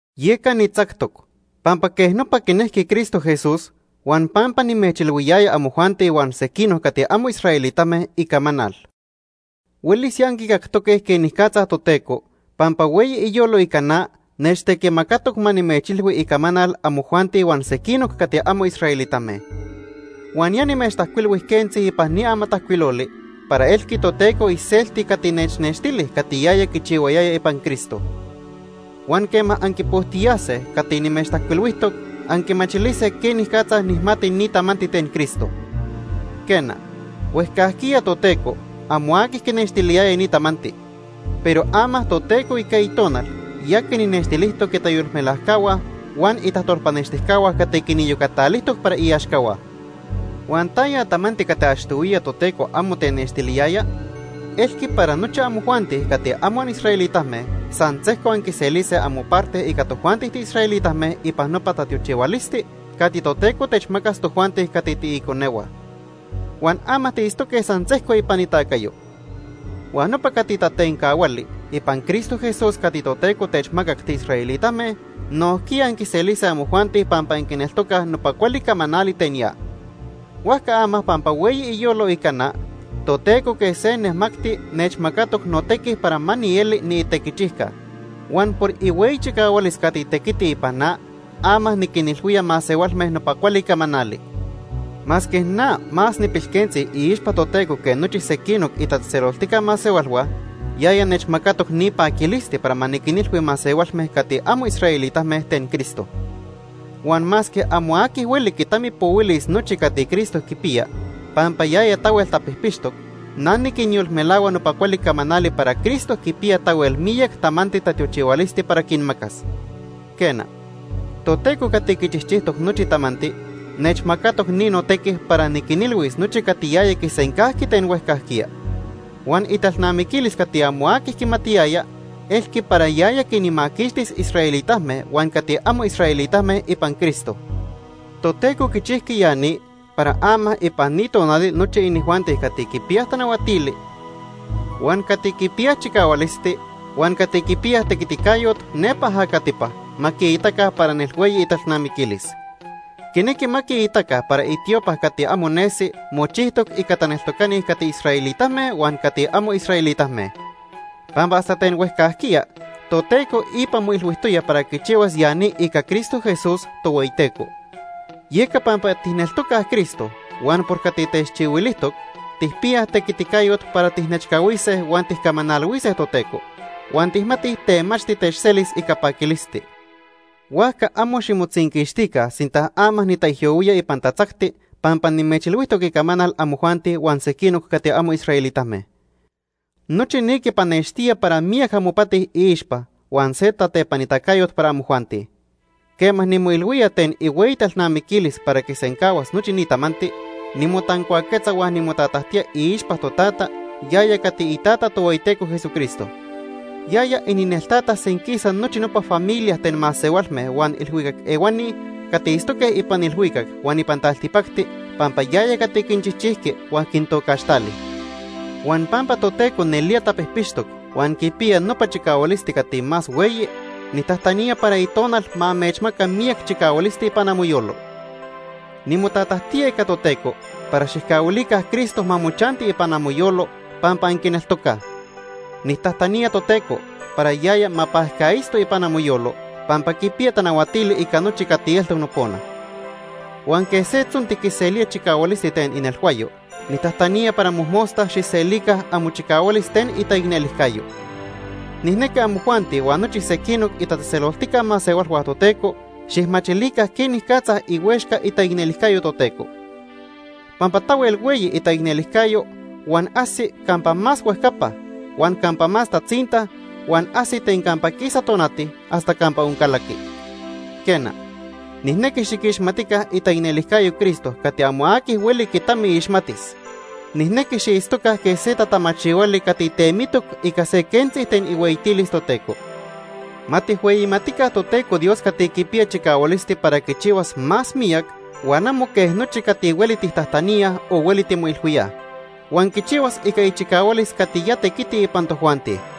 Yeca nitzactoc, pampa quej nopa quinejqui Cristo Jesús huan pampa nimechilhuiyaya amojuanti huan sequinoc cati amo israelitame icamanal. Huelis ya anquicactoque quenicatza Toteco, pampa hueyi iyolo ica na, nechtequimacatoc ma nimechilhui icamanal amojuanti huan sequinoc cati amo israelitame. Huan ya nimechtajcuilhui quentzi ipan ni amatajcuiloli para elqui Toteco iselti cati nechnextili cati yaya quichihuayaya ipan Cristo. Huan quema anquipojtiyase cati nimechtajcuilhuijtoc, anquimachilise quenicatza nijmati ni tamanti ten Cristo. Quena, huejcajquiya Toteco amo aqui quinextiliyaya ni tamanti, pero ama Toteco ica Itonal ya quinnextilijtoc itayolmelajcahua huan itajtolpanextijcahua cati quiniyocatalijtoc para iaxcahua. Huan ¿taya tamanti cati achtohuiya Toteco amo tenextiliyaya? Elqui para nochi amojuanti cati amo anisraelitame san sejco anquiselise amoparte ica tojuanti tiisraelitame ipan nopa tatiochihualisti cati Toteco techmacas tojuanti cati tiiconehua. Huan ama tiitztoque san sejco ipan itacayo. Huan nopa cati tatencahuali ipan Cristo Jesús cati Toteco techmacac tiisraelitame, nojquiya anquiselise amojuanti pampa anquineltocaj nopa cuali camanali ten ya. Huajca ama pampa hueyi iyolo ica na, Toteco quej se nemacti nechmacatoc notequi para ma nieli niitequichijca. Huan por ihueyi chicahualis cati tequiti ipan na, ama niquinilhuía masehualme nopa cuali camanali. Masque na más nipilquentzi iixpa Toteco que nochi sequinoc itatzejtzeloltica masehualhua, yaya nechmacatoc ni paquilisti para ma niquinilhui masehualme cati amo israelitame ten Cristo. Huan masque amo aqui hueli quitamipohuilis nochi cati Cristo quipiya pampa yaya tahuel tapijpixtoc, na niquinyolmelahua nopa cuali camanali para Cristo quipiya tahuel miyac tamanti tatiochihualisti para quinmacas. Quena, Toteco cati quichijchijtoc nochi tamanti nechmacatoc ni notequi para niquinilhuis nochi cati yaya quisencajqui ten huejcajquiya. Huan italnamiquilis cati amo aqui quimatiyaya elqui para yaya quinmaquixtis israelitame huan cati amo israelitame ipan Cristo. Toteco quichijqui ya ni para ama ipan ni tonali nochi inijuanti cati quipiyaj tanahuatili, huan cati quipiyaj chicahualisti huan cati quipiya tequiticayot nepa ajacatipa ma quiitaca para nelhueyi italnamiquilis. Quinequi ma quiitaca para itiopa cati amo nesi mochijtoc ica taneltocani cati israelitame huan cati amo israelitame. Pampa hasta ten huejcajquiya Toteco ipa moilhuijtoya para quichihuas ya ni ica Cristo Jesús, Tohueyiteco. Yeca pampa tijneltocaj Cristo huan por cati techchihuilijtoc, tijpiyaj tequiticayot para tijnechcahuise huan tijcamanalhuise Toteco; huan tijmatij temachti techselis ica paquilisti. Huajca amo ximotzinquixtica sinta ama nitaijyohuía ipan tatzacti pampa nimechilhuijtoc icamanal amojuanti huan sequinoc cati amo israelitame. Nochi ni quipanextía para miyac amopati iixpa huan se tatepanitacayot para amojuanti. Quema nimoilhuía ten ihueyi talnamiquilis para quisencahuas nochi ni tamanti, nimotancuaquetza huan nimotatajtía iixpa Totata, yaya cati iTata Tohueyiteco Jesucristo. Yaya inineltata senquisa nochi nopa familia ten masehualme huan ilhuicac ehuani cati itztoque ipan ilhuicac huan ipan taltipacti pampa yaya cati quinchijchijqui huan quintocaxtali. Huan pampa Toteco nelía tapijpixtoc huan quipiya nopa chicahualisti cati más hueyi, nijtajtanía para Itonal ma amechmaca miyac chicahualisti ipan amoyolo. Nimotatajtía ica Toteco para xijcahuilica Cristo ma mochanti ipan amoyolo pampa anquineltocaj. Nijtajtanía Toteco para yaya ma pajcaitzto ipan amoyolo pampa quipiya tanahuatili ica nochi cati eltoc nopona. Huan quej se tzonti quiselía chicahualisti ten inelhuayo, nijtajtanía para mojmosta xijselica amochicahualis ten itaicnelijcayo. Nijnequi amojuanti huan nochi sequinoc itatzejtzeloltica masehualhua Toteco xijmachilica quenicatza ihuexca itaicnelijcayo Toteco. Pampa tahuel hueyi itaicnelijcayo huan ajsi campa más huejcapa, huan campa más tatzinta, huan ajsi ten campa quisa tonati hasta campa oncalaqui. Quena, nijnequi xiquixmatica itaicnelijcayo Cristo cati amo aqui hueli quitamiixmatis. Nijnequi xiitztoca quej se tatamachihuali cati temitoc ica se quentzi ten ihueyitilis Toteco. Ma tijhueyimatica Toteco Dios cati quipiya chicahualisti para quichihuas más miyac huan amo quej nochi cati hueli tijtajtaníaj o hueli timoilhuíaj. Huan quichihuas ica ichicahualis cati ya tequiti ipan tojuanti.